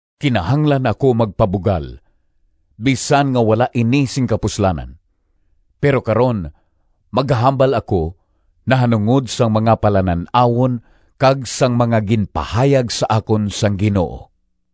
Kinahanglan ako magpabugal, bisan nga wala ini sing kapuslanan. Pero karon magahambal ako nahanungod sang mga palanan-awon kag sang mga ginpahayag sa akon sang Ginoo.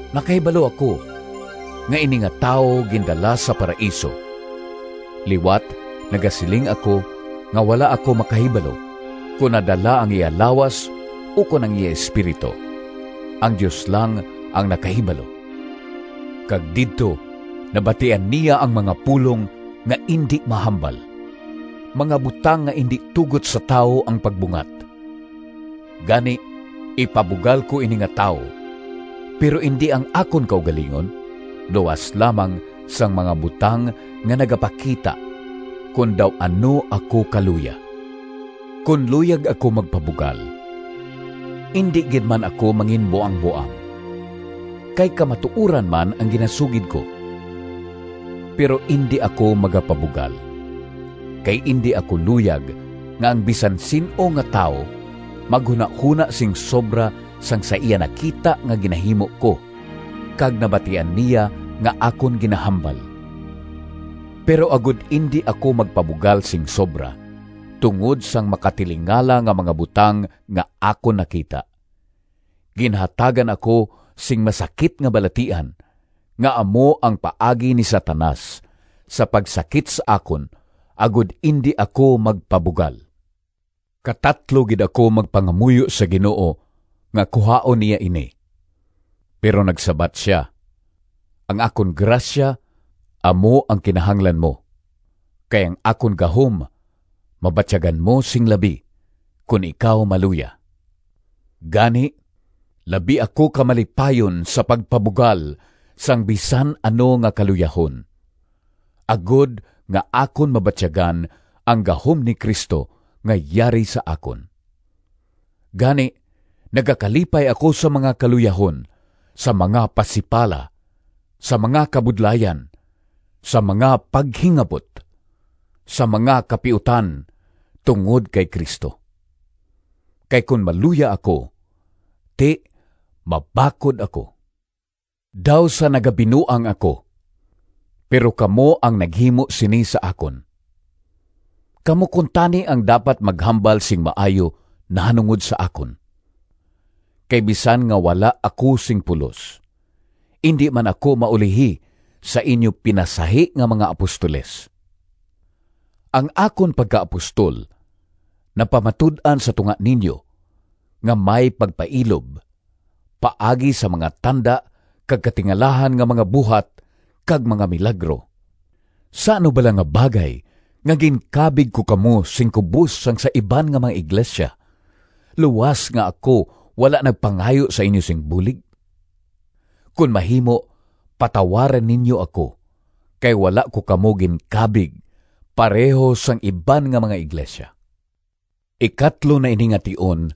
Nakahibalo ako nga ini nga tawo gindala sa Paraiso (liwat nagasiling ako nga wala ako makahibalo kon nadala ang iya lawas ukon ang iya espiritu—ang Dios lang ang nakahibalo), kag didto nabatian niya ang mga pulong nga indi mahambal, mga butang nga indi tugot sa tawo ang pagbungat. Gani ipabugal ko ini nga tawo, pero indi ang akon kaugalingon, luas lamang sang mga butang nga nagapakita kon daw ano ako kaluya. Kon luyag ako magpabugal, indi gid man ako manginbuangboang, kay kamatuoran man ang ginasugid ko. Pero indi ako magapabugal, kay indi ako luyag nga ang bisan sin-o nga tawo maghunahona sing sobra sang sa iya nakita nga ginahimo ko kag nabatian niya nga akon ginahambal. Pero agod indi ako magpabugal sing sobra tungod sang makatilingala nga mga butang nga akon nakita, ginhatagan ako sing masakit nga balatian, nga amo ang paagi ni Satanas sa pagsakit sa akon agod indi ako magpabugal. Katatlo gid ako magpangamuyo sa Ginoo nga kuhaon niya ini. Pero nagsabat sia, “Ang akon grasya amo ang kinahanglan mo, kay ang akon gahom mabatyagan mo sing labi kon ikaw maluya.” Gani labi ako ka malipayon sa pagpabugal sang bisan ano nga kaluyahon, agod nga akon mabatyagan ang gahom ni Cristo nga yari sa akon. Gani nagakalipay ako sa mga kaluyahon, sa mga pasipala, sa mga kabudlayan, sa mga paghingabot, sa mga kapiutan tungod kay Cristo. Kay kon maluya ako, ti mabakod ako. Daw sa nagabinuang ako, pero kamo ang naghimo sini sa akon. Kamo kuntani ang dapat maghambal sing maayo nahanungod sa akon. Kay bisan nga wala ako sing pulos, indi man ako maulihi sa inyo pinasahi nga mga “apostoles”. Ang akon pagkaapostol napamatud-an sa tunga ninyo nga may pagpailob paagi sa mga tanda kag katingalahan nga mga buhat kag mga milagro. Sa ano bala nga bagay nga ginkabig ko kamo sing kubos sang sa iban nga mga iglesia, luas nga ako wala nagpangayo sa inyo sing bulig? Kon mahimo patawara ninyo ako kay wala ko kamo ginkabig pareho sang iban nga mga iglesia! Ikatlo na ini nga tion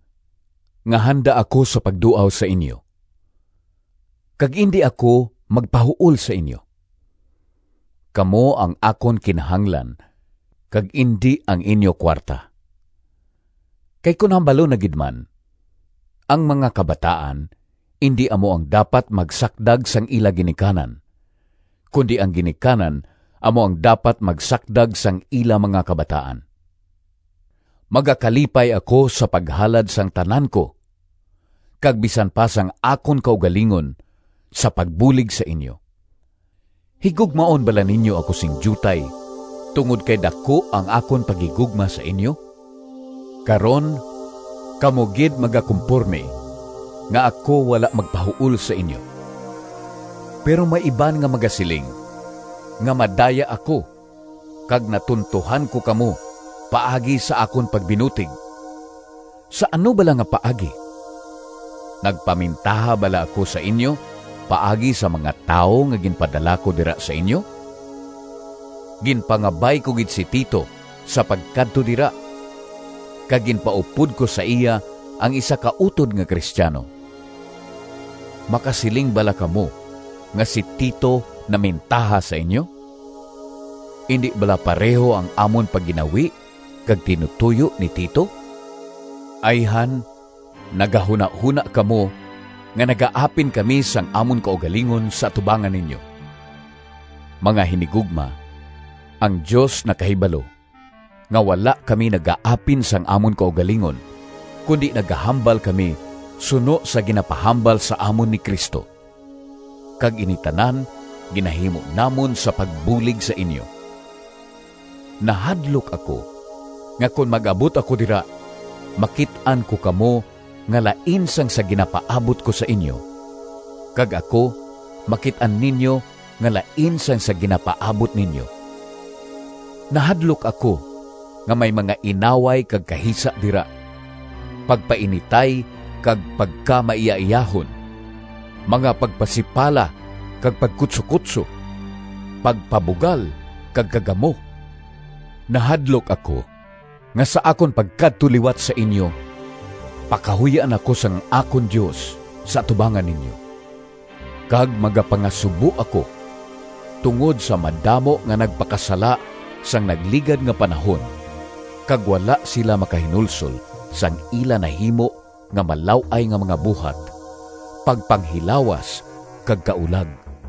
nga handa ako sa pagduaw sa inyo, kag indi ako magpahuol sa inyo. Kamo ang akon kinahanglan kag indi ang inyo kuwarta. Kay kon hambalon na gid man, ang mga kabataan indi amo ang dapat magsakdag sang ila ginikanan, kundi ang ginikanan amo ang dapat magsakdag sang ila mga kabataan. Magakalipay ako sa paghalad sang tanan ko, kag bisan pa sang akon kaugalingon sa pagbulig sa inyo. Higugmaon bala ninyo ako sing diutay tungod kay daku ang akon paghigugma sa inyo? Karon kamo gid magakumpormi nga ako wala magpahuol sa inyo. Pero may iban nga magasiling nga madaya ako kag natuntohan ko kamo paagi sa akon pagbinutig. Sa ano bala nga paagi? Nagpamintaha bala ako sa inyo paagi sa mga tawo nga ginpadala ko dira sa inyo? Ginpangabay ko gid si Tito sa pagkadto dira, kag ginpaupod ko sa iya ang isa ka utod nga Cristiano. Makasiling bala kamo nga si Tito namintaha sa inyo? Indi bala pareho ang amon pagginawi kag tinutoyo ni Tito? Ayhan nagahunahona kamo nga nagaapin kami sang amon kaugalingon sa atubangan ninyo. Mga hinigugma, ang Dios nakahibalo nga wala kami nagaapin sang amon kaugalingon, kundi nagahambal kami suno sa ginapahambal sa amon ni Cristo, kag ini tanan ginahimo namon sa pagbulig sa inyo. Nahadlok ako nga kon mag-abot ako dira makit-an ko kamo nga lain sang sa ginapaabot ko sa inyo, kag ako makit-an ninyo nga lain sang sa ginapaabot ninyo. Nahadlok ako nga may mga inaway kag kahisa dira, pagpainitay kag pagkamaiyaiyahon, mga pagpasipala kag pagkutsokutso, pagpabugal kag kagamo. Nahadlok ako nga sa akon pagkadto liwat sa inyo pakahuy-an ako sang akon Dios sa atubangan ninyo, kag magapangasubo ako tungod sa madamo nga nagpakasala sang nagligad nga panahon kag wala sila makahinulsol sang ila nahimo nga malaw-ay nga mga buhat, pagpanghilawas kag kaulag.